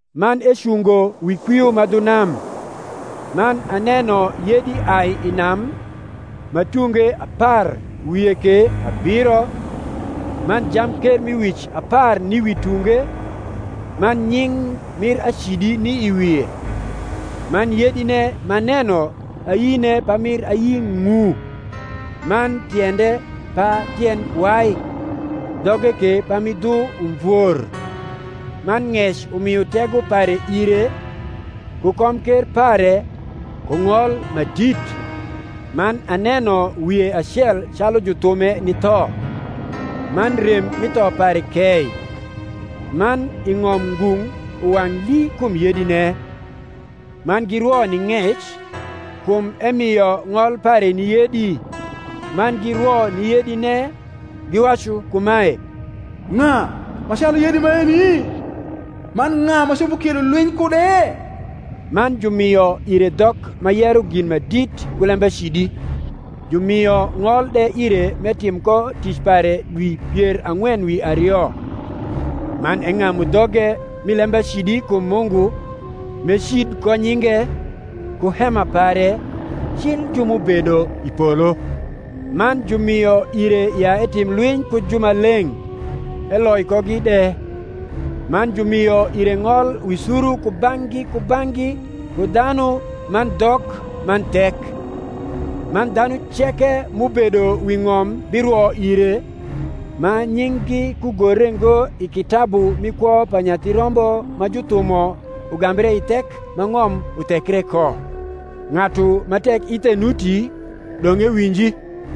Man ecungo wi kwio ma dhu nam. Man aneno yedi ai i nam, ma tunge apar wie ke abiro, man jamkermiwic apar ni wi tunge, man nying’ mir acidi ni i wie. Man yedine m’aneno ayine pamir ayi ng’u, man tiende pa tiend wai, dhoge ke pami dhu umvor: man ng’ec umio tego pare ire, ku komker pare, ku ng’ol ma dit. Man aneno wie acel calu juthume ni tho; man rem mi tho pare kei: man i ng’om ngung’ uwang’ lii kum yedine; man girwo ni ng’ec, kum emio ng’ol pare ni yedi; man girwo ni yedine, giwacu kumae, Ng’a ma calu yedi maeni? man ng’a ma copo kiedo lwiny kude? man jumio ire dhok ma yero gin ma dit ku lembacidi; jumio ng’ol de ire m’etim ko tic pare dwi pier ang’wen wi ario. Man eng’amu dhoge mi lembacidi kum Mungu, m’ecid ko nyinge, ku hema pare, cil ju m’ubedo i polo. Man jumio ire ya etim lwiny ku jumaleng’, eloi kogi de: man jumio ire ng’ol wi suru kubang’gi kubang’gi ku dhanu man dhok man thek. Man dhanu ceke m’ubedo wi ng’om birwo ire, ma nying’gi kugore ngo i kitabu mi kwo pa Nyathi Rombo ma juthumo ugambre i thek ma ng’om uthekre ko. Ng’atu ma tek ithe nuti, dong’ ewinji.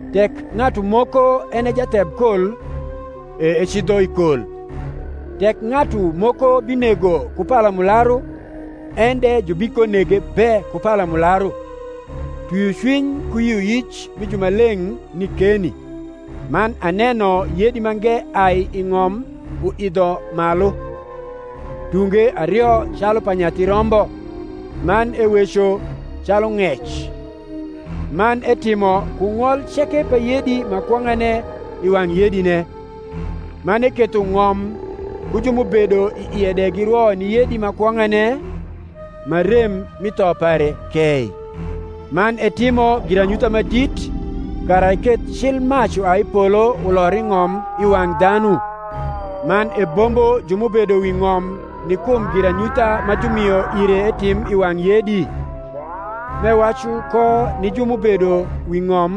Tek ng’atu moko en e jathebkol, e ecidho i kol: tek ng’atu moko binego ku palamularu, en de jubikonege be ku palamularu. Twiocwiny ku yioyic mi jumaleng’ ni keni. Man aneno yedi mange ai i ng’om uidho malu; tunge ario calu pa nyathi rombo, man eweco calu ng’ec. Man etimo ku ng’ol ceke pa yedi ma kwong’ane i wang’ yedine. Man eketho ng’om ku ju m’ubedo i ie de girwo ni yedi ma kwong’ane, ma rem mi tho pare kei. Man etimo giranyutha ma dit, kara eketh cil mac uai i polo ulor i ng’om i wang’ dhanu. Man ebombo ju m’ubedo wi ng’om ni kum giranyutha ma jumio ire etim i wang’ yedi; m’ewacu ko ni ju m’ubedo wi ng’om,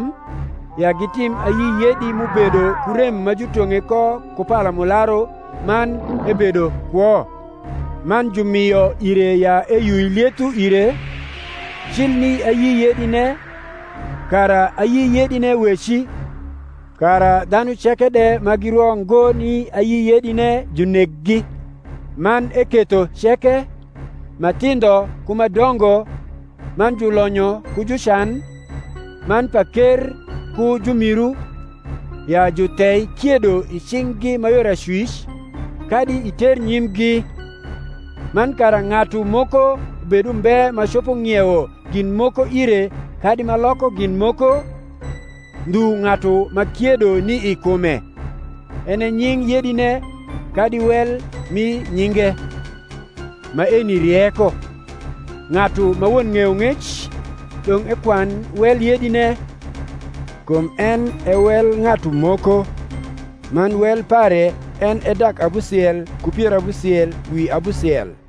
ya gitim ayi yedi m’ubedo ku rem ma jutong’e ko ku palamularu man ebedo kwo. Man jumio ire ya eyui lietho ire, cil ni ayi yedine, kara ayi yedine weci, kara dhanu ceke de ma girwo ngo ni ayi yedine juneggi. Man eketho ceke, ma thindho ku ma dongo, man julonyo ku jucan, man paker ku jumiru, ya juthei kiedo i cing’gi ma yor acwic, kadi i ternyimgi; man kara ng’atu moko bed umbe ma copo ng’iewo gin moko ire kadi ma loko gin moko, ndhu ng’atu ma kiedo ni i kume, en e nying’ yedine kadi wel mi nyinge. Maeni rieko. Ng’atu ma won ng’eyong’ec, dong’ ekwan wel yedine; kum en e wel ng’atu moko: man wel pare en e dak abusiel ku pier abusiel wi abusiel.